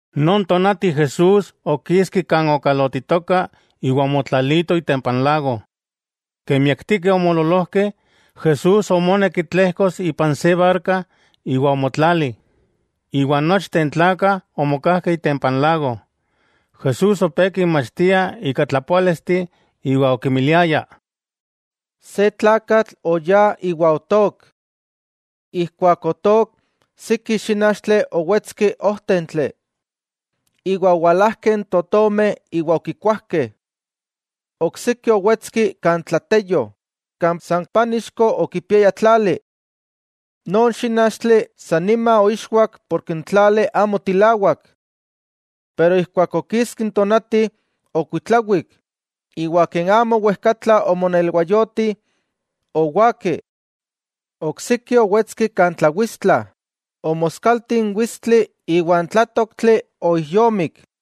Non tonati Jesús okiski kan okalotitoka iwa omotlalito itempa n lago. Ken miaktikeh omoololojkeh, Jesús omonek tlejkos ipan se barka iwa omotlali, iwa nochteh n tlakah omokajkeh itempa n lago. Jesús opé kinmachtia ika tlapoálisteh, iwa okinmiliaya: —Se tlakatl oyá iwa otook. Ijkuak otook, siki xínachtli owetski ojtentli, iwa owalajkeh n totomeh iwa okikuajkeh. Oksiki owetski kan tlateyo, kan san pánixko okipiaya tlali. Non xínachtli sa nima oixwak porke n tlali amo tilawak. Pero ijkuak okiski n tonati, okuitlawik, iwa ken amo wejkatla omonelwayoti, owaki. Oksiki owetski kan tlawitstla, omoskalti n witstli iwa n tlátoktli oijyomik.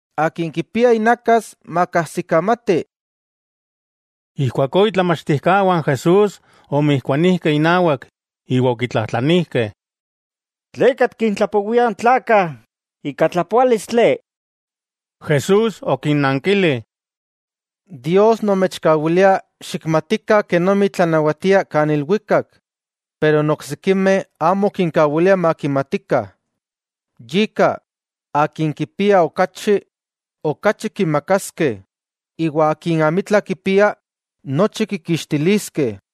Akin kipia inakas, makajsikamati. Ijkuakó itlamachtijkawah n Jesús omijkuanijkeh inawak, iwa okitlajtlanijkeh: —¿Tleka tikintlapowia n tlakah ika tlapoálistli? Jesús okinnankili: —Dios nomechkawilia xikmatikah kenomi tlanawatia kan ilwikak, pero n oksikimeh amo kinkawilia makimatikah. Yika, akin kipia okachi, okachi kimakaskeh, iwa akin amitla kipia, nochi kikixtiliskeh.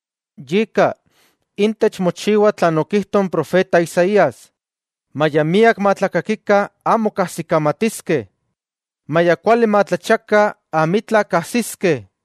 Yika, intech mochiwa tlan okijto n profeta Isaías: Maya miak matlakakikah, amo kajsikamatiskeh; maya kuali matlachiakah amitla kajsiskeh.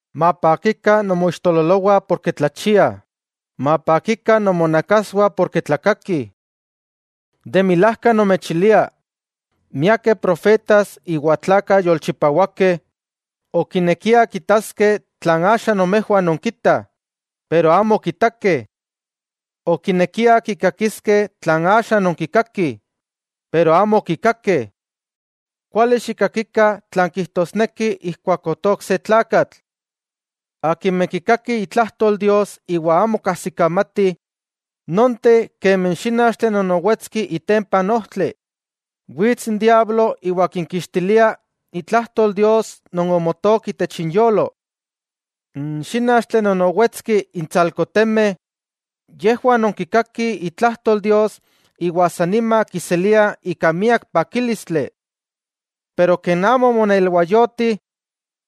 'Mapakikah nomoixtololowah porke tlachiah, mapakikah nomonakaswah porke tlakakih. De milajka nomechilia, miakeh profetas iwa tlakah yolchipawakeh okinekiah kitaskeh tlan axa nomejwah nonkitah, iwa amo okitakeh. Okinekiah kikakiskeh tlan axa nonkikakih, iwa amo okikakeh. 'Kuali xikkakikah tlan kijtosneki ijkuak otook se tlakatl. Akimeh kikakih itlajtol Dios iwa amo kajsikamatih, nonteh kemi n xínachtli non owetski itempa ojtli, wits n diablo iwa kinkixtilia itlajtol Dios non omotook itech inyolo. N xínachtli non owetski intsalko temeh, yejwah non kikakih itlajtol Dios iwa sa nima kiseliah ika miak pakílistli. Pero ken amo omonelwayoti,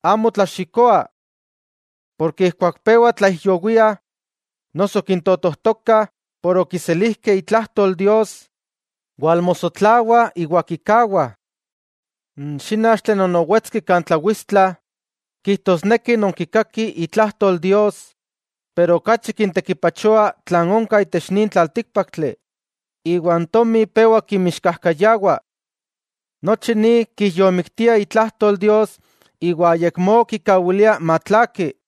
amo tlaxikoah. Ijkuak pewah tlaijyowiah noso kintotojtokah por okiselijkeh itlajtol Dios, walmosotlawah iwa kikawah. N xínachtli non owetski kan tlawitstla, kijtosneki non kikakih itlajtol Dios, pero okachi kintekipachoa tlan onka itech nin tlaltíkpaktli iwa n tomi pewa kinmixkajkayawa. Nochi ni kijyomiktia itlajtol Dios iwa ayakmó kikawilia matlaaki.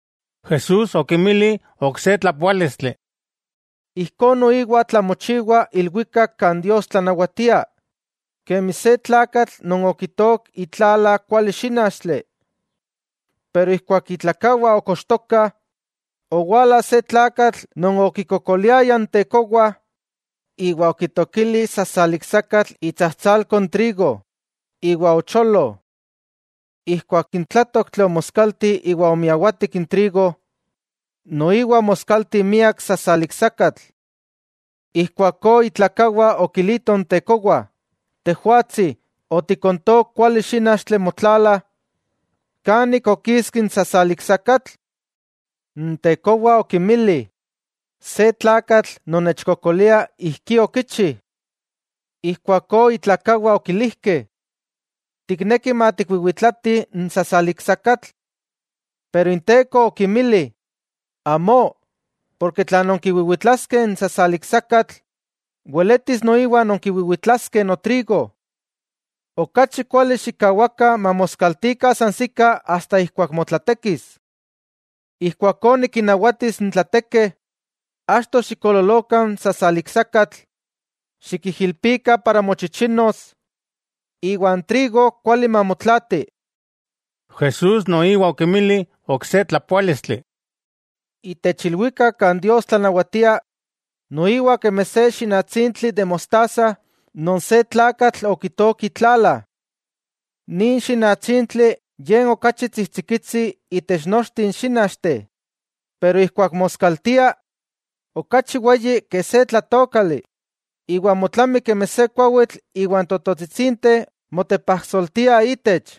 Jesús okinmili ok se tlapoálistli: —Ijkó noiwa tlamochiwa ilwikak kan Dios tlanawatia, kemi se tlakatl non okitook itlala kuali xínachtli. Pero ijkuak itlakawah okochtokah, owala se tlakatl non okikokoliaya n tekowa, iwa okitookili sasaliksakatl itsajtsalko n trigo, iwa ocholo. Ijkuak n tlátoktli omoskalti iwa omiawatik n trigo, noiwa omoskalti miak sasaliksakatl. Ijkuakó itlakawah okilitoh n tekowa: “Tejwatsi otikontook kuali xínachtli motlala. ¿kan ik okiski n sasaliksakatl?” N tekowa okinmili: “Se tlakatl non nechkokolia ijkí okichi.” Ijkuakó itlakawah okilijkeh: “¿Tikneki matikwiwitlatih n sasaliksakatl?” Pero inteko okinmili: “Amó, porke tla nonkiwiwitlaskeh n sasaliksakatl, weletis noiwa nonkiwiwitlaskeh notrigo. Okachi kuali xikkawakah mamoskaltikah sansikah asta ijkuak motlatekis. Ijkuakó nikinnawatis n tlatekeh: “Achto xikololokah n sasaliksakatl, xikijilpikah para mochichinos; iwa n trigo kuali mamotlaati.” Jesús noiwa okinmili ok se tlapoálistli: —Itech ilwikak kan Dios tlanawatia, noiwa kemi se xinatsintli de mostaza non se tlakatl okitook itlala. Nin xinatsintli ye n okachi tsijtsikitsi itech nochteh n xínachteh, pero ijkuak moskaltia, okachi weyi ke se tlátookali, iwa motlami kemi se kuawitl iwa n tototsitsinteh motepajsoltiah itech.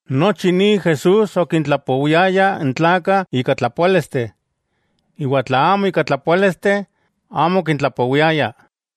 Nochi ni Jesús okintlapowiaya n tlakah ika tlapoálisteh, iwa tla amo ika tlapoálisteh, amo okintlapowiaya.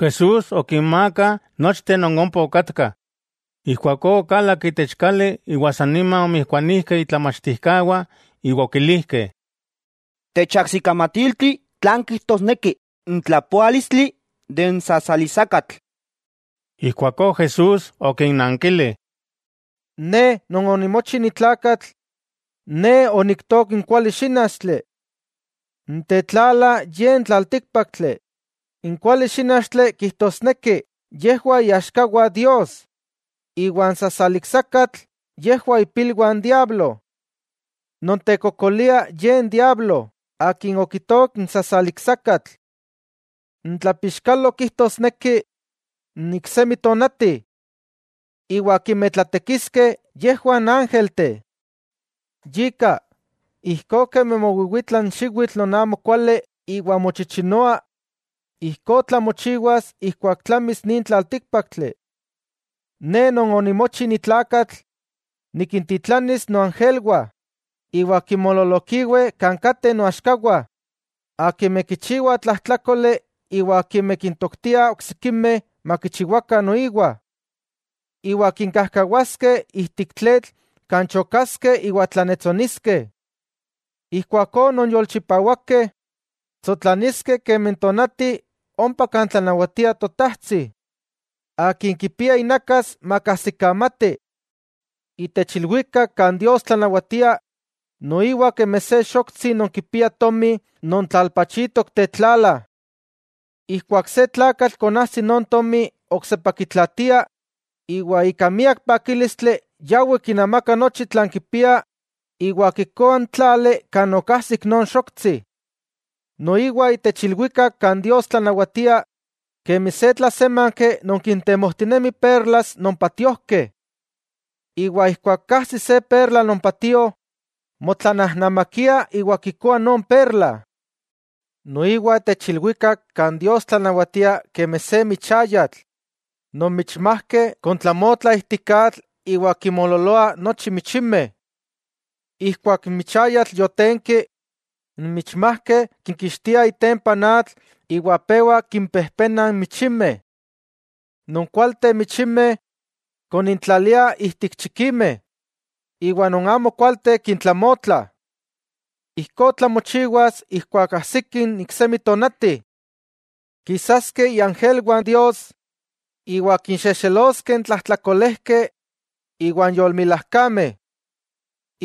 Jesús okinmakah nochteh non ompa okatkah. Ijkuakó okalak itech kali iwa sanima omijkuanijkeh itlamachtijkawah iwa okilijkeh: —Techajsikamatiltih tlan kijtosneki itlapoalis n sasaliksakatl. Ijkuakó Jesús okinnankili: —Ne Non onimochi ni tlakatl, Ne oniktook n kuali xínachtli. N tetlala ye n tlaltíkpaktli. N kuali xínachtli kijtosneki yejwah iaxkawah Dios, iwa n sasaliksakatl, yejwah ipilwah n diablo. Non tekokolia ye n diablo akin okitook n sasaliksakatl. N tlapixkalo kijtosneki n iksemi tonati. Iwa akimeh tlatekiskeh yejwah n ángelteh. Yika, ijkó kemi mowiwitla n xiwitl non amo kuali iwa mochichinoa, ijkó tlamochiwas ijkuak tlamis nin tlaltíkpaktli. Ne Non onimochi ni tlakatl nikintitlanis noangelwah, iwa kinmoololokiweh kan kateh noaxkawah akimeh kichiwah tlajtlákoli iwa akimeh kintoktiah oksikimeh makichiwakah noiwah. Iwa kinkajkawaskeh ijtik tletl kan chokaskeh iwa tlannetsoniskeh. Ijkuakó non yolchipawakeh, tsotlaniskeh kemi n tonati ompa kan tlanawatia Totajtsi. ¡Akin kipia inakas, makajsikamati! 'Itech ilwikak kan Dios tlanawatia, noiwa kemi se xoktsi non kipia tomi non tlalpachitok tetlala. Ijkuak se tlakatl konajsi non tomi oksepa kitlaatia, iwa ika miak pakílistli yawi kinamaka nochi tlan kipia iwa kikoa n tlali kan okajsik non xoktsi. 'Noiwa itech ilwikak kan Dios tlanawatia kemi se tlasémanki non kintemojtinemi perlas non patiojkeh, iwa ijkuak kajsi se perla non patio, motlanajnamakia iwa kikoa non perla. 'Noiwa itech ilwikak kan Dios tlanawatia kemi se michayatl non michmajkeh kontlamotlah ijtik atl iwa kinmoololoa nochi michimeh. Ijkuak n michayatl yotenki, n michmajkeh kikixtiah itempa n atl iwa pewa kimpejpenah n michimeh. Non kualteh michimeh konintlaliah ijtik chikimeh, iwa non amo kualteh kintlamotlah. Ijkó tlamochiwas ijkuak ajsiki n iksemi tonati. Kisaskeh iangelwah Dios iwa kinxexeloskeh n tlajtlakolejkeh iwan yolmilajkameh.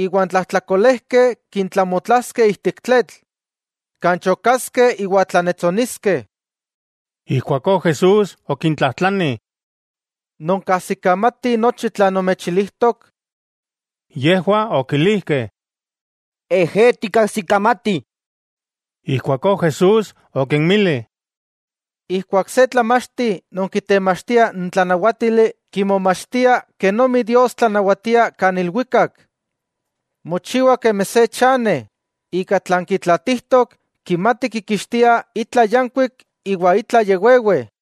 Iwa n tlajtlakolejkeh kintlamotlaskeh ijtik tletl, kan chokaskeh iwa tlannetsoniskeh. Ijkuakó Jesús okintlajtlani: —¿Nonkajsikamatih nochi tlan nomechilijtok? Yejwah okilijkeh: —Ejé, tikkajsikamatih. Ijkuakó Jesús okinmili: —Ijkuak se tlamachti non kitemachtia n tlanawátili kimomachtia kenomi Dios tlanawatia kan ilwikak, mochiwa kemi se chane, ika tlan kitlatijtok kimati kikixtia itla yankuik iwa itla ya wewe.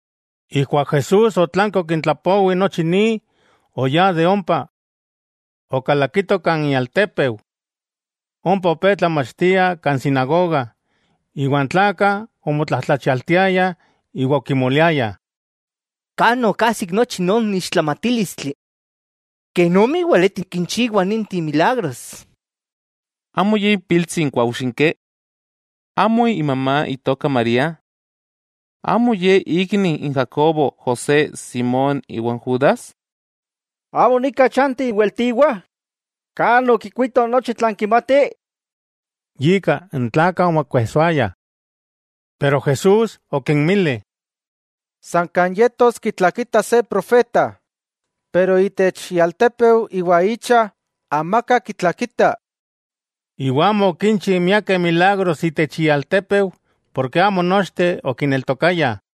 Ijkuak Jesús otlanki okintlapowi nochi ni, oyá de ompa. Okalakito kan ialtépeu. Ompa opé tlamachtia kan sinagoga, iwa n tlakah omotlajtlachialtiayah iwa okimoliayah: —¿Kan okajsik nochi non ixtlamatílistli? ¡Kenomi weleti kinchiwa ninteh milagros! ¿Amo ye ipiltsi n kuaujxinki? ¿Amo imamá itoka María? ¿Amo ye ikni n Jacobo, José, Simón iwa n Judas? Amo nika chanti iweltiwah. ¿Kan okikuito nochi tlan kimati? Yika, n tlakah omokuejsoayah. Pero Jesús okinmili: —San kan yetos kitlakitah se profeta, pero itech ialtépeu iwa icha, amaka kitlakita. Iwa amo okinchi miakeh milagros itech ialtépeu, porke amo nochteh okineltokaya.